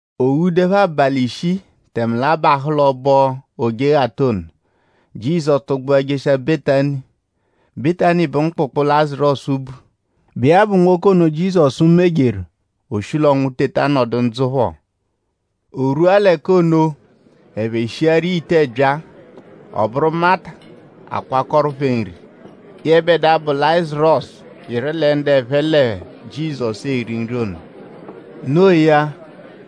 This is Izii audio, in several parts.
O ghuduẹpho abalị ishii tẹme l'a bahụ l'ọbo Ojeghata ono; Jizọsu tụgbua jeshia Betani. Betani bụ mkpụkpu, Lazarọsu bu, bụ iya bụ nwoke ono, Jizọsu mejeru; o shi l'ọnwu teta nọdu ndzụ phọ. O rwua l'ẹka ono; ẹphe shiaru iya ite ẹbyaa. Ọ bụru Mata akwakọru phẹ nri; yẹbedua, bụ Lazarọsu yịru lẹ ndu ẹphe lẹ Jizọsu eri nri ono. No iya;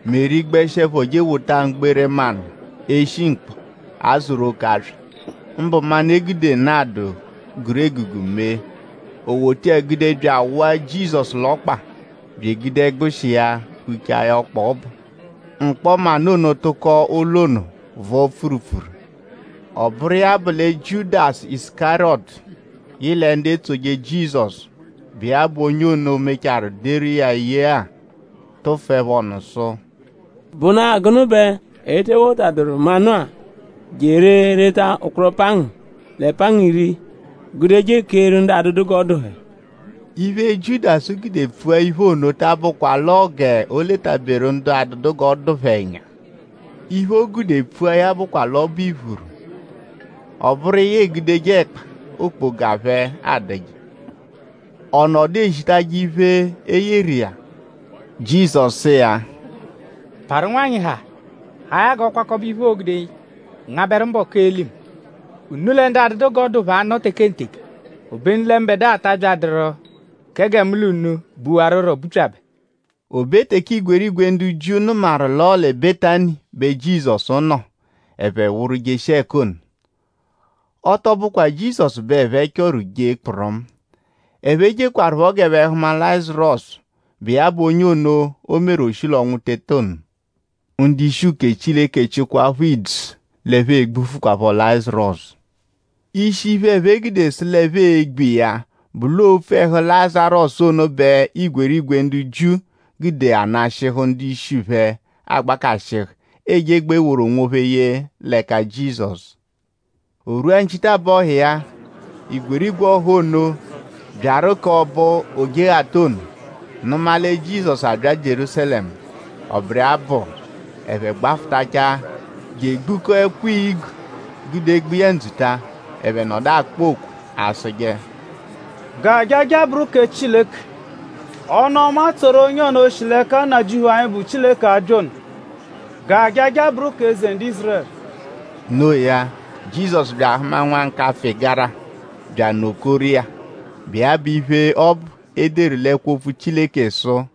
Meri gbẹshiepho je ewota mgbere manụ, eshi mkpọ, a zụru oke aswa; mbụ manụ, e gude nadụ, guru egugu mee. O wota iya gude bya awụa Jizọsu l'ọkpa bya egude ẹgbushi iya huchaa ya ọkpa ọbu. Mkpọ manụ ono tụko ụlo ono vọo pfurupfuru. Ọ bụru iya bụ lẹ Jiudasu Isukariyọtu, yị lẹ ndu etsoje Jizọsu, bụ iya bụ onye ono, mechaarụ deru iya ye-a; tụfuepho ọnu sụ: “?Bụna-a gụnu bẹ e te wotadụru manụ-a je eree reta ụkporo pangu lẹ pangu iri gude je ekeeru ndu adụdu g'ọ dụ phẹ?” Iphe, Jiudasu gude pfua iphe ono ta abụkwa l'ọo g'o letaberu ndu adụdu g'ọ dụ phẹ ẹnya. Iphe, o gude pfua ya bụkwa l'ọ bụ iphuru; ọ bụru iya egudeje ẹkpa, okpoga phẹ adụje; ọ nọdu ezitajẹ iphe, e yeru iya. Jizọsu sụ iya: “Parụ nwanyị haa! Haa ya g'ọ kwakọbe iphe, o gude ngabẹru mbọku, ee-li mu. Unu lẹ ndu adụdu g'ọ dụ phẹ anọ tekenteke; obenu lẹ mbẹdua ta abyadụru kẹ gẹ mu l'unu buwarurọ bupyabẹ.” O be teke igwerigwe ndu Jiu nụmaru l'ọo lẹ Betani bẹ Jizọsu nọ; ẹphe wụru jeshia ẹka ono. Ọ tọ bụkwaa Jizọsu bẹ ẹphe chọru jee kpụrumu. Ẹphe jekwarụpho g'ẹphe hụma Lazarọsu, bụ iya bụ onye ono, o meru; o shi l'ọnwu teta ono. Ndu-ishi uke Chileke chịkwaapho idzu l'ẹphe e-gbufukwaaphọ Lazarọsu. Ishi iphe, ẹphe gude sụ l'ẹphe e-gbu iya bụ l'ọo opfu ẹhu Lazarọsu ono bẹ igwerigwe ndu Jiu gude anashịhu ndu-ishi phẹ agbakashịhu ejegbaa eworu onwophẹ ye l'ẹka Jizọsu. O rwua nchitabọhu iya; igwerigwe ọha ono, byaru k'ọbo Ojeghata ono nụma lẹ Jizọsu abya Jierúsalẹmu. Ọ bụru iya bụ ẹphe gbafụtachaa je egbukọo ẹkwo-igu gude gba iya ndzuta. Ẹphe nọdu akpọ okwe asụje: “G'ajaja bụru kẹ Chileke! Ọnu-ọma tsoru onye ono, shi l'ẹka Nnajịuphu anyi, bụ Chileke abya ono! G'ajaja bụru kẹ Eze ndu Ízurẹlu!” No iya; Jizọsu bya ahụma nwa nkapfụ-ịgara bya anọ-koru iya, bụ iya bụ iphe ọbu, e deru l'ẹkwo Opfu Chileke sụ: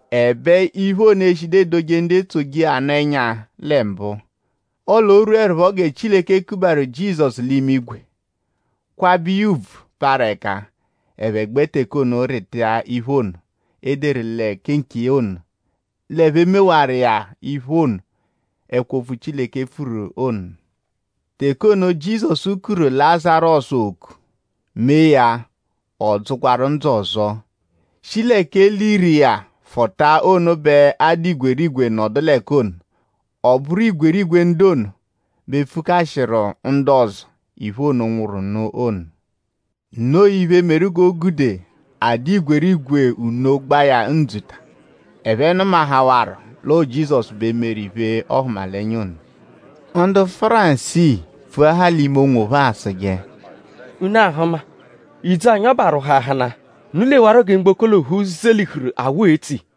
Ẹbe iphe ono eshidu edoje ndu etsoje iya nụ ẹnya lẹ mbụ. Ọle o -rwuẹrupho gẹ Chileke kubataru Jizọsu l'imigwe; kwabẹ iya ùbvù, parụ ẹka; ẹphe gbẹ teke ono rịta iphe ono, e deru kẹ nkiya ono; l'ẹphe mewaru iya iphe ono, ẹkwo-opfu Chileke pfuru ono. Teke ono, Jizọsu kuru Lazarọsu oku; mee ya ọ dzụkwaru ndzụ ọzo; shi l'ẹka e liru iya fụta ono bẹ a dụ igwerigwe nọdu l'ẹka ono. Ọ bụru igwerigwe ndu ono bẹ pfukashịru ndu ọzo iphe ono, nwụru nụ ono. Noo iphe, meru g'o gude a dụ igwerigwe nno gba iya ndzuta. Ẹphe nụmahawaru l'ọo Jizọsu bẹ meru iphe-ọhumalenya ono. Ndu Fárisii pfuahaa l'ime onwophẹ asụje: “Unu ahụma. Idzu anyi ọbu arwụhuahanaa. Unu lewarọ gẹ mgboko l'ophu zelihuru awụ etso iya.”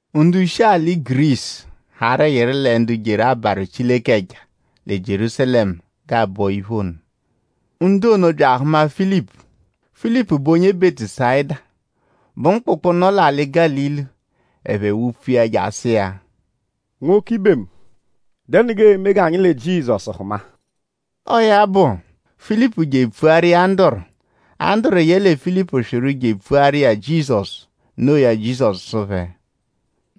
Ndu shi l'alị Gurisu harụ yịru lẹ ndu jeru abarụ Chileke ẹja lẹ Jierúsalẹmu g'aabọ iphe ono. Ndu ono bya ahụma Filipu; Filipu bụ onye Bẹtusayida, bụ mkpụkpu, nọ lẹ Gálili. Ẹphe wupfu iya je asụ iya: “Nwoke-ibe mu!?Dẹnu g'eeme g'anyi lẹ Jizọsu hụma?” Ọo ya bụ; Filipu je epfuaru iya Anduru. Anduru yẹle Filipu swịru je epfuaru iya Jizọsu. Noo ya; Jizọsu sụ phẹ: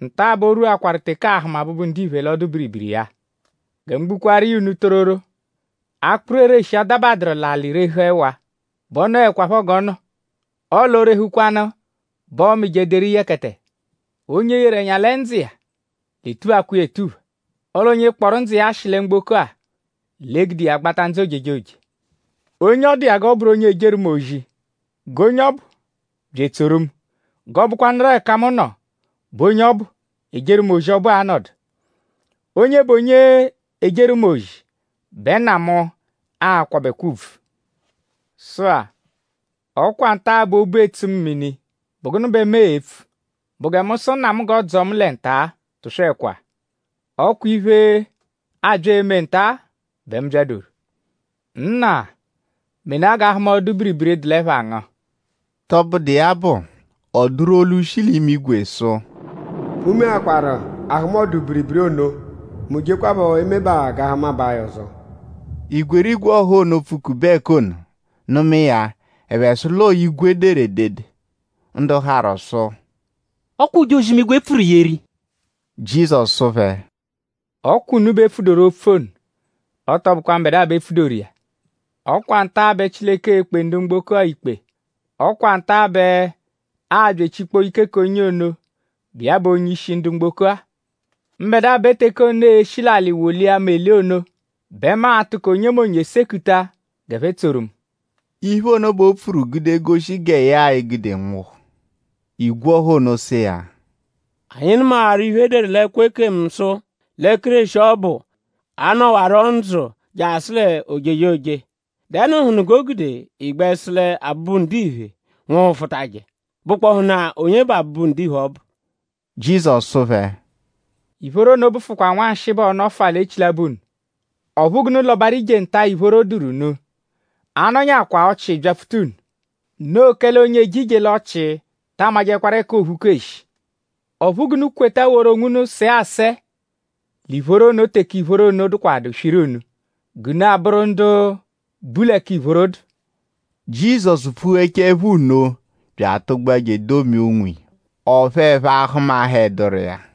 “Nta-a bẹ o rwuakwaru teke aa-hụma Abụbu-Ndiphe l'ọdu-biribiri iya. Gẹ mu gbukwaaru iya unu tororo; akpụru ereshi -adabadụru l'alị rehu ẹwa bẹ ọ nọekwapho g'ọ nọ. Ọle o -rehukwanu bẹ ọomije deru yẹkete. Onye yeru ẹnya lẹ ndzụ iya l'e-tuphakwa iya etupha; ọle onye kpọru ndzụ iya ashị lẹ mgboko-a l'e-gude iya gbata ndzụ ojejoje. Onye ọ dụ iya g'ọ bụru onye ejeru mu ozi g'onye ọbu bya etsoru mu g'ọo-bụkwanuru ẹka mu nọ bẹ onye ọbu, ejeru mu ozi ọbu a-nọdu. Onye bụ onye ejeru mu ozi bẹ Nna mu a-kwabẹkwa ùbvù.” “Sụ-a; ọ kwa nta-a bẹ obu etsu mu mini.?Bụ gụnu bẹ mu e-pfu??Bụ gẹ mu sụ Nna mu g'ọ dzọo mu lẹ nta-a? Tụswekwa! Ọ kwa iphe, abya eme nta-a bẹ mu byadoru.” “Nna! Menaa g'a hụma ọdu-biribiri dụ l'ẹpha ngu.” Tọbudu iya bụ; ọ dụru olu, shi l'imigwe sụ: “Mu meakwaru a hụma ọdu-biribiri ono; mu jekwaphọ emebaa g'a hụmabaa ya ọzo.” Igwerigwe ọha ono, pfukube ẹka ono nụma iya; ẹphe sụ l'ọo igwe deru edede. Ndu harụ sụ: “Ọ kwa ojozi-imigwe pfuru yeru iya!” Jizọsu sụ phẹ: “Ọ kwa unu bẹ e pfudoru opfu ono; ọ tọ bụkwa mbẹdua bẹ e pfudoru iya. Ọ kwa nta-a bẹ Chileke e-kpe ndu mgboko-a ikpe. Ọ kwa nta-a bẹ aabya echikpọ ike k'onye ono, bụ iya bụ onye-ishi ndu mgboko-a. Mbẹdua bẹ teke ono, ee-shi l'alị wolia mu eli ono bẹ mu a-tụko onyemonye sekuta g'ẹphe tsoru mu.” Iphe ono bẹ o pfuru gude goshi gẹ ya e-gude nwụhu. Igwe ọha ono sụ iya: “Anyi nụmawaru iphe, e deru l'ẹkwo ekemu sụ lẹ Kéreshi ọbu anọduwaro ndzụ jasụ l'ojejoje.?Dẹnuhunu g'o gude ị gbẹ sụ lẹ Abụbu-Ndiphe nwụhufutaje??Bụkpohunaa onye bụ Abụbu-Ndiphe ọbu?” Jizọsu sụ phẹ: “Ìphóró ono bụfukwa nwanshịi bẹ ọo-nọfua l'echilabọ unu. Ọphu g'unu lọbaru ije nta, ìphóró dụru unu; a -nọnyakwa ọchii byapfuta unu. Noo kẹle onye eje ije l'ọchii ta amajẹkwaru ẹka o phuku eshi. Ọphu g'unu kweta woru onwunu sẹe asẹe l'ìphóró ono teke ìphóró ono dụkwadu swiru unu g'unu abụru ndu bu l'ẹka ìphóró dụ.” Jizọsu pfughechaẹpho nno bya atụgbua je edomia onwiya; ọphu ẹphe ahụmaheduru iya.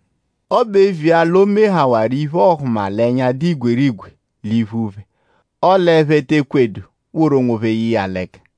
Ọ bụ eviya l'o mehawaru iphe-ọhumalenya, dụ igwerigwe l'iphu phẹ; ọle ẹphe te ekwedu woru onwophẹ ye iya l'ẹka.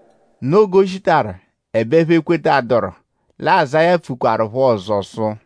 Noo g'o shitaru; ẹbe ẹphe ekwetaduru. Lẹ Azáya pfukwarụpho ọzo sụ: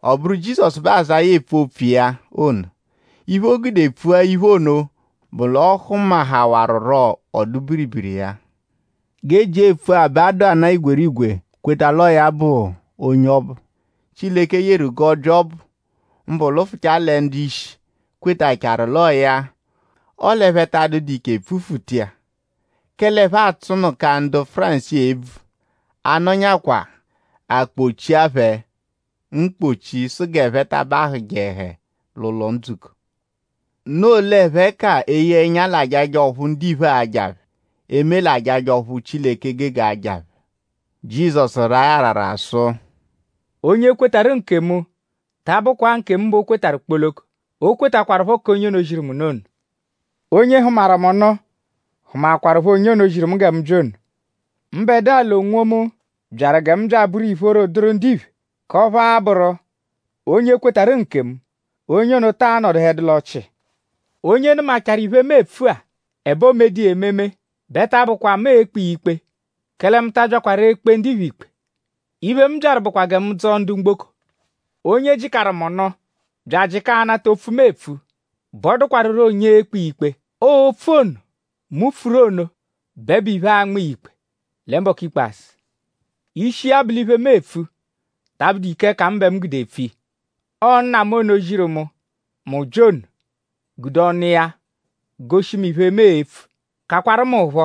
Ọ bụru Jizọsu bẹ Azáya epfu opfu iya ono. Iphe, o gude pfua iphe ono bụ l'ọ hụmahawaruro ọdu-biribiri iya. G'e jia epfua bẹ a dụana-a igwerigwe kweta l'ọo ya bụ onye ọbu, Chileke yeru g'ọ bya ọbu; mbụ lụfuchaa lẹ ndu-ishi kwetachaakwaru l'ọo ya. Ọle ẹphe ta adụdu ike pfufuta iya; kẹle ẹphe atsụnuka ndu Fárisii ebvu; a -nọnyakwaa; a kpochia phẹ mkpọchi sụ g'ẹphe ta abatajẹhe l'ụlo-ndzukọ. Noo l'ẹphe ka eye ẹnya l'ajaja ọphu ndiphe aja phẹ; eme l'ajaja ọphu Chileke gege aja phẹ. Jizọsu raa ya arara sụ: “Onye kwetarụ nkemu ta abụkwa-a nkemu bẹ o kwetarụ kpoloko; o kwetakwarụpho k'onye ono ziru mu nụ ono. Onye hụmaru mu nụ hụmaakwarupho onye ono, ziru mu gẹ mu bya ono. Mbẹdua l'onwomu byaru gẹ mu bya abụru ìphóró dụru ndiphe; k'ọphu a-bụru; onye kwetarụ nkemu; onye ono taa nọduhedu l'ọchii. Onye nụmachaaru iphe-a, mu epfu-a; ẹbe o medu iya ememe; bẹ ta abụkwa mu e-kpe iya ikpe; kẹle mu ta abyakwaru ekpe ndiphe ikpe. Iphe, mu byaru bụkwa gẹ mu dzọo ndu mgboko. Onye jịkaru mu nụ; bya ajịka anata opfu, mu epfu bẹ ọ dụkwaruro onye e-kpe iya ikpe. Ọo opfu ono, mu pfuru ono bẹ bụ iphe, a-nma iya ikpe lẹ mbọku ikpazụ. Ishi iya bụ l'iphe, mu epfu ta abụdu ike ẹka mu bẹ mu gude epfu iya. Ọo Nna mu ono, ziru mu; mu bya ono gude ọnu iya goshi mu iphe, mu e-pfu; kakwaru mu phọ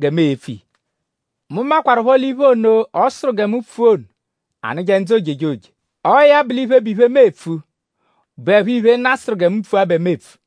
gẹ mu e-pfu iya. Mu makwarụpho l'iphe ono, ọ sụru gẹ mu pfua ono anụje ndzụ ojejoje. Ọo ya bụ l'iphe, bụ iphe, mu epfu bụepho iphe, Nna sụru gẹ mu pfua bẹ mu epfu.”